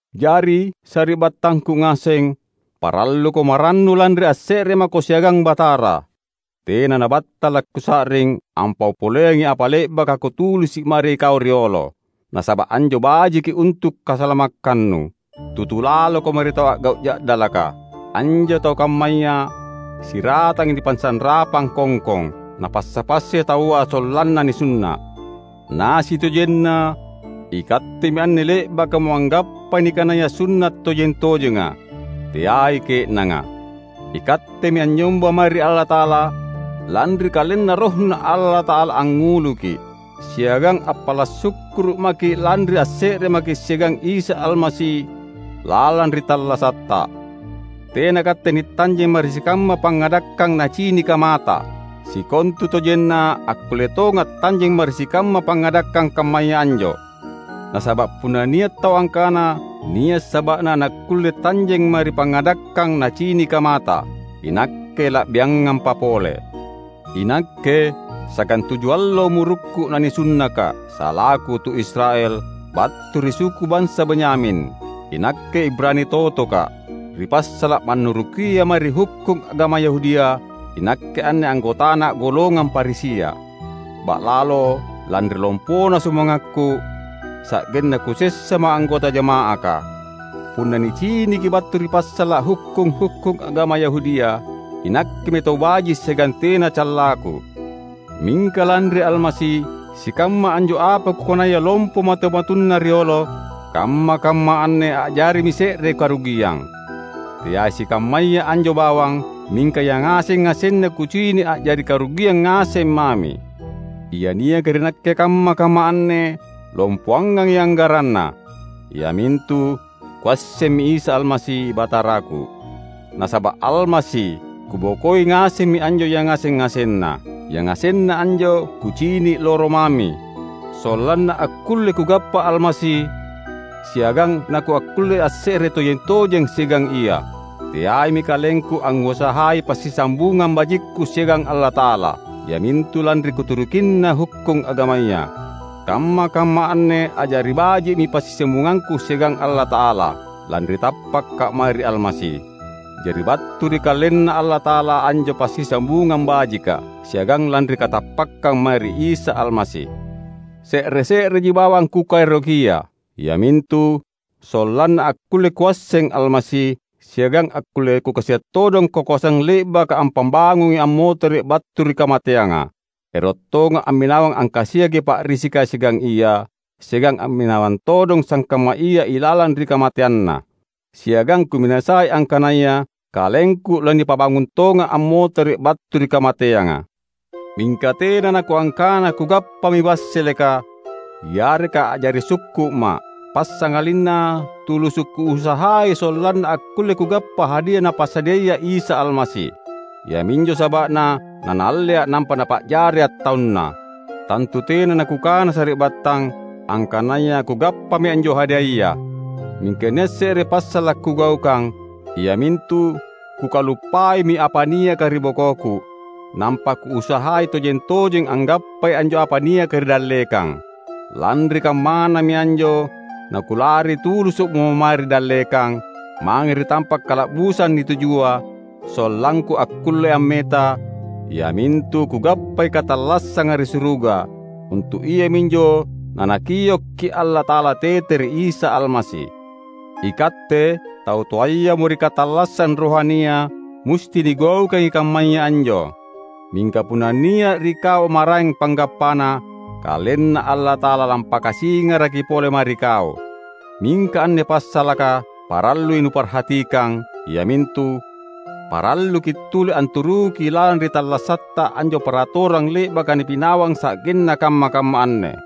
Jari, sari’battangku ngaseng, paralluko marannu lanri asse’re mako siagang Batara. Tena nabattala’ kusa’ring ampau poleangi apa le’baka kutulisi’ mae ri kau riolo; nasaba’ anjo bajiki untu’ kasalamakkannu. Tutu laloko mae ri tau a’gau’ ja’dalaka. Anjo tau kammaya siratangi nipasanrapang kongkong. Napassa-passai taua sollanna nisunna’. Na sitojenna ikattemi anne le’bakamo anggappai nikanaya sunna’ tojeng-tojenga; teai ke’nanga. Ikattemi anynyomba mae ri Allata’ala lanri KalenNa RohNa Allata’ala angnguluki’; siagang appala’ sukkuru’ maki’ lanri asse’re maki’ siagang Isa Almasi lalang ri tallasatta. Tena katte nitanjeng mae ri sikamma pangngadakkang nacinika mata. Sikontutojenna akkulle tonga’ tanjeng mae ri sikamma pangngadakkang kammaya anjo. Nasaba’ punna nia’ tau angkana nia’ saba’na nakkulle tanjeng mae ri pangngadakkang nacinika mata, inakke la’biangampa pole. Inakke, sagantuju allo umurukku nanisunnaka’, salaku tu Israel, battu ri suku bansa Benyamin. Inakke Ibrani totoka’. Ri passala’ mannurukia mae ri hukkung agama Yahudia, inakke anne anggotana’ golongang Farisia. Ba’lalo, lanri lompona sumangakku, sa’genna kusessamo anggota jama’aka. Punna niciniki battu ri passala’ hukkung-hukkung agama Yahudia, inakkemi tau baji’ siagang tena callangku. Mingka lanri Almasi, sikamma anjo apa kukanaya lompo matu-matunna riolo, kamma-kamma anne a’jarimi se’re karugiang. Teai sikammaya anjo bawang; mingka yangaseng-ngasenna kucini’ a’jari karugiang ngaseng mami. Ia niaka ri nakke kamma-kamma anne lompoangangi anggaranna: iamintu kuassemmi Isa Almasi, Bataraku. Nasaba’ Almasi, kubokoi ngasemmi anjo yangaseng-ngasenna. Yangasenna anjo kucini’ loro mami, sollanna akkulle kugappa Almasi, siagang nakuakkulle asse’re tojeng-tojeng siagang Ia. Teaimi kalengku angngusahai passisambungang bajikku siagang Allata’ala, iamintu lanri kuturukinna hukkung agamaya. Kamma-kamma anne a’jari baji’mi passisambungangku siagang Allata’ala, lanri tappaka’ mae ri Almasi. Jari battu ri KalenNa Allata’ala anjo passisambungang bajika, siagang lanri katappakkang mae ri Isa Almasi. Se’re-se’reji bawang kukaerokia, iamintu: sollanna akkulle kuasseng Almasi, siagang akkulle kukasia’ todong kakoasang le’baka ampabangungi ammotere’ battu ri kamateanga. Ero’ tonga’ amminawang angkasiaki pa’risika siagang Ia, siagang amminawang todong sangkamma Ia ilalang ri kamateanNa. Siagang kuminasai angkanaya kalengku lanipabangung tonga’ ammotere’ battu ri kamateanga. Mingka tena nakuangkana kugappami wasseleka, yareka a’jari sukku’ma’. Passangalinna tulusu’ kuusahai sollanna akkulle kugappa hadia Napasadiaya Isa Almasi. Iaminjo saba’na naNaallea’ nampa Napa’jaria’ taunNa. Tantu tena nakukana sari’battang, angkanaya kugappami anjo hadiaya. Mingka nia’ se’re passala’ kugaukang; iamintu kukaluppaimi apa niaka ri bokoku, nampa kuusahai tojeng-tojeng anggappai anjo apa niaka ri dallekang. Lanri kammanami anjo nakulari tulusu’mo mae ri dallekang, mange ri tampa’ kala’busang nitujua, sollangku akkulle ammeta, iamintu kugappai katallassanga ri suruga; untu’ iaminjo naNakiokki’ Allata’ala tete ri Isa Almasi. Ikatte, tau toayamo ri katallassang rohania, musti nigaukangi kammaya anjo. Mingka punna nia’ ri kau maraeng panggappana, KalenNa Allata’ala lampakasingaraki pole mae ri kau. Mingka anne passalaka parallui nuparhatikang, iamintu: Paralluki’ tuli anturuki lalang ri tallasatta anjo paratorang le’baka nipinawang sa’genna kamma-kamma anne.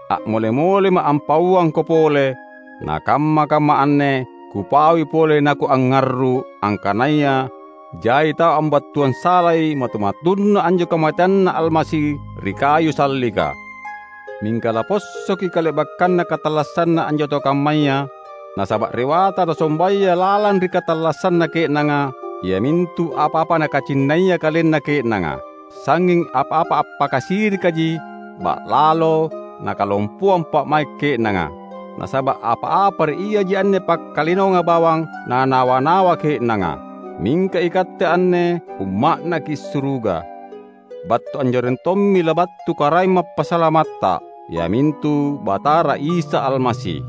A’mole-molema’ ampauangko pole, nakamma-kamma anne kupaui pole nakuangngarru’ angkanaya jai tau ambattuang salai matu-matunna anjo kamateanNa Almasi ri kayu sallika. Mingka lapossoki kale’bakkanna katallassanna anjo tau kammaya; nasaba’ rewata nasombaya lalang ri katallassanna ke’nanga, iamintu apa-apa nakacinnaia kalenna ke’nanga. Sangnging apa-apa appakasirikaji ba’lalo nakalompoang pa’mai’ ke’nanga; nasaba’ apa-apa ri iaji anne pakkalinoanga bawang nanawa-nawa ke’nanga. Mingka ikatte anne umma’naki’ suruga. Battu anjoreng tommi labattu Karaeng Mappasalamatta, iamintu Batara Isa Almasi.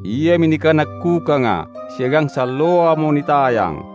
Iami nikanakkukanga, siagang salloamo nitayang.